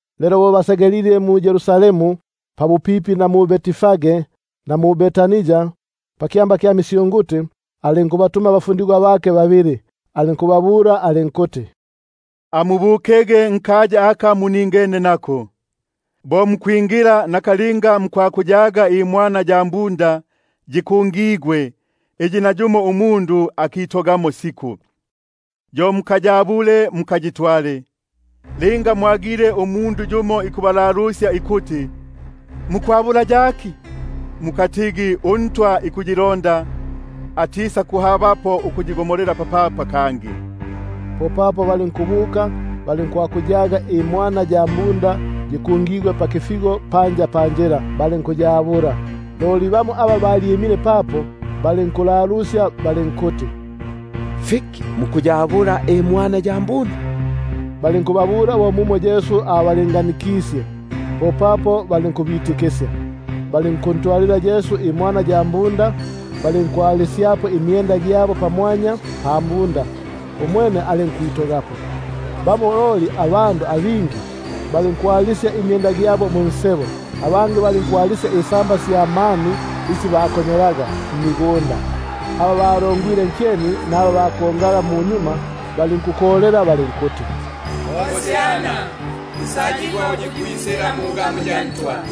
Lelo bo bikusegelela mu-Yerusalemu, pabupipi na Betfage na Betania, pakyamba kya misyunguti, alinkubatuma abafundigwa bake babili alinkubabula alinkuti: Amubukege nkaya aka muningene nako, bo mukwingila mutisakuhabapo ukuyaga imwana ya mhunda yikungigwe, iyi nayumo akitogamo siku, yo mukayabule, mukayitwale. Linga yumo ikubalalusya ikuti: Fiki mukubomba bo sisisi? mukatigi; uMalafyale ikuyilonda, atisakuhabapo ukuyigo- molela papapa kangi. Popapo balinkubuka, balinkwakuyaga imwana ya mhunda yikungigwe pakifigo panja pansebo, balinkuyabula. Loli bamo aba balyimile papo balinkulalusya balinkuti: Mukubomba fiki apa mukuyabula imwana ya mhunda? Balinkubabula bo mumo Yesu abalinganikisye, popapo balinkubitikisya. Balinkuntwalila Yesu imwana ya mhunda, balinkuyalisyapo imyenda gyabo, umwene alinkwito- gapo. Bingi balinkwalisya imyenda gyabo munjila, abangi utusamba twa mani utu bakonyolaga mmigunda. Aba balongwile nkyeni, naba bakongaga balinkukolela balinkuti: Hosiana, nsayigwa uyu ikwisila mungamu ya Ntwa;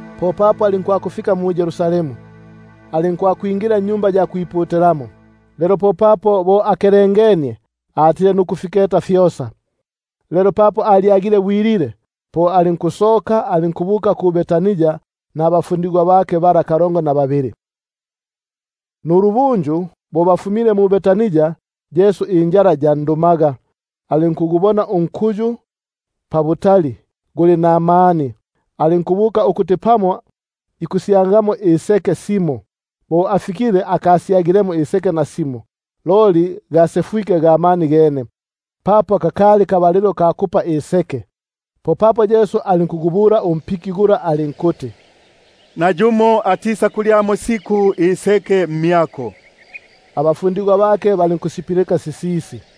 Popapo alinkwakufika mu-Yerusalemu, alinkwakwingila mwa Tempeli. Alinkukelengania nukufiketa fyosa, lelo papo alyagile bwilile, po alinkusoka alinkubuka mu-Betania nabakalongo na babili bala. Nulubunju bo bafumile mu-Betania, injala yandumaga. Alinkugubona unkuyu pabutali guli namani, alinkubuka ukuti pamo ikufyagangamo fimo; bo afikile akafyagilemo nafimo loli gene ga mani, papo kakali kabalilo ka kupa iseke. Popapo alinkugubula alinkuti: Nayumo angisakulyamo iseke mmyako siku. Abafundigwa bake balinkusipilika sisisi.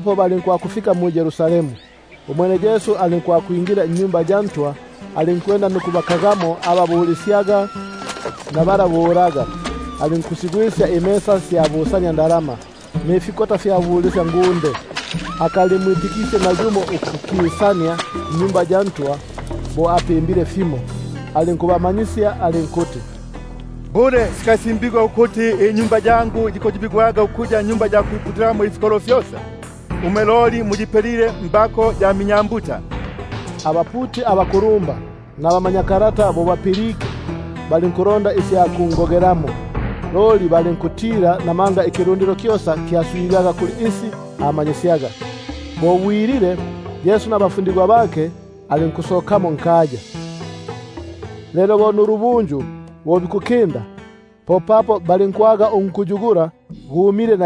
Balinkwakufika mu-Yerusalemu. Bo ikwingila mwa Tempeli, alinkwanda ukubakagamo mwa Tempeli aba bulisyaga naba bulaga, alinkukupusya ifitalati fya busaniandalama, nifikota fya bulisyangunde; akalimwitikisye nayumo ukuki- sania mwa Tempeli bo apimbile fimo. Alinkubamanyisya alinkuti: Bule sikasimbigwa ukuti: Inyumba yangu yikuyobigwaga ukuya nyumba ya kwiputilamo ifikolo fyosa? Umwe loli muyipelile mbako ya minyambuta. Abaputi abakulumba nabamanyakalata bo bapilike, balinkulonda isya kungogelamo, loli balinkutila, namanga ikilundilo kyosa kyaswigaga kuli isi amanyisyaga. Bo bwilile, alinkusokamo nkaya. Lelo nulubunju bo bikukinda, balinkwaga unkuyu gumile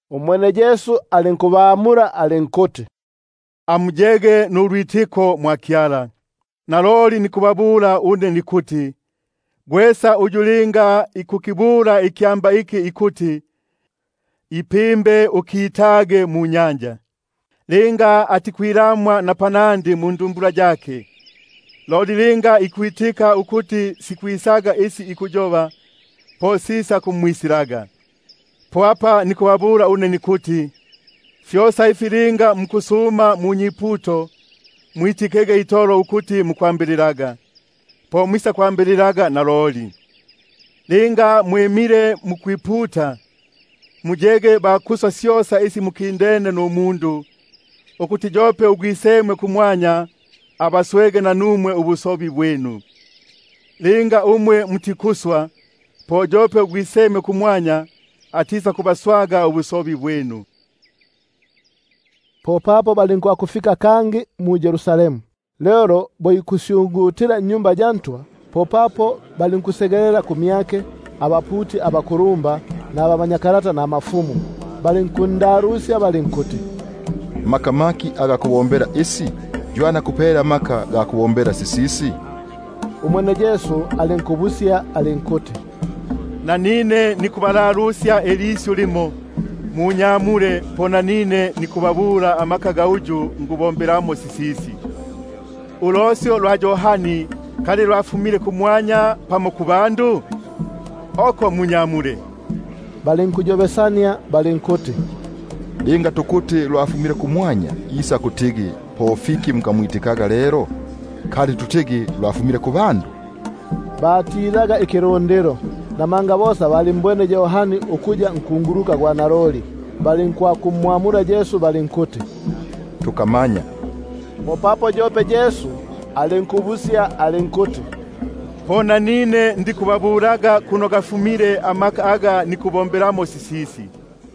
Umwene Yesu alinkubamula alinkuti: Amuyege nulwitiko mwa Kyala. Naloli nikubabula une nikuti, gwesa uyu linga ikukibula ikyamba iki ikuti: Gwipimbe ukitage munyanja! linga atikwilamwa mundumbula yake, loli ikwitika ukuti sikwisaga isi ikuyoba, po sisakumwisilaga. Po apa nikubabula nikuti: Syosa isi linga mukwiputa nukusuma, mwiti- kege itolo ukuti mwambilile, po sikubisilaga. Linga mwimile mukwiputa, muyege ba kuswa syosa isi mukindene numundu, ukuti yope uGwisemwe kumwanya abaswege nanumwe ubu- sobi bwinu. Loli linga mutikuswa, po yope uGwisemwe kumwanya atisakubaswaga ubusobi bwinu. Popapo balinkwisa kangi mu-Yerusalemu. Lelo bo ikusyungutila mwa Tempeli, balinkwisa kumyake abaputi abaku- lumba nabamanyakalata nabakulumba, balinkumbula balinkuti: Maka maki aga kubombela isi? Ywani akupele amaka ga kubombela sisisi? Umwene Yesu alinkubabula alinkuti: Nanine nikubalalusya ilisyu limo; munyamule po nanine nikubabulaga amaka ga uyu ngubombelamo sisisi. Ulosyo lwa Yohani kali lwafumile kumwanya pamo kubandu? Munyamule. Balinkuyobesania balinkuti: Linga tukuti lwafumile kumwanya, isakutigi po fiki mukamwitigaka lelo? Loli kali tutigi lwafumile kubandu? — batilaga ikilundilo, namanga bosa balimbwene Yohani ukuya nkunguluka gwa naloli. Balinkumwamula Yesu balinkuti: Tukamanya. Popapo Yesu alinkubabula alinkuti: Po nanine ndikubabulaga amaka ga uyu nikubombelamo sisisi.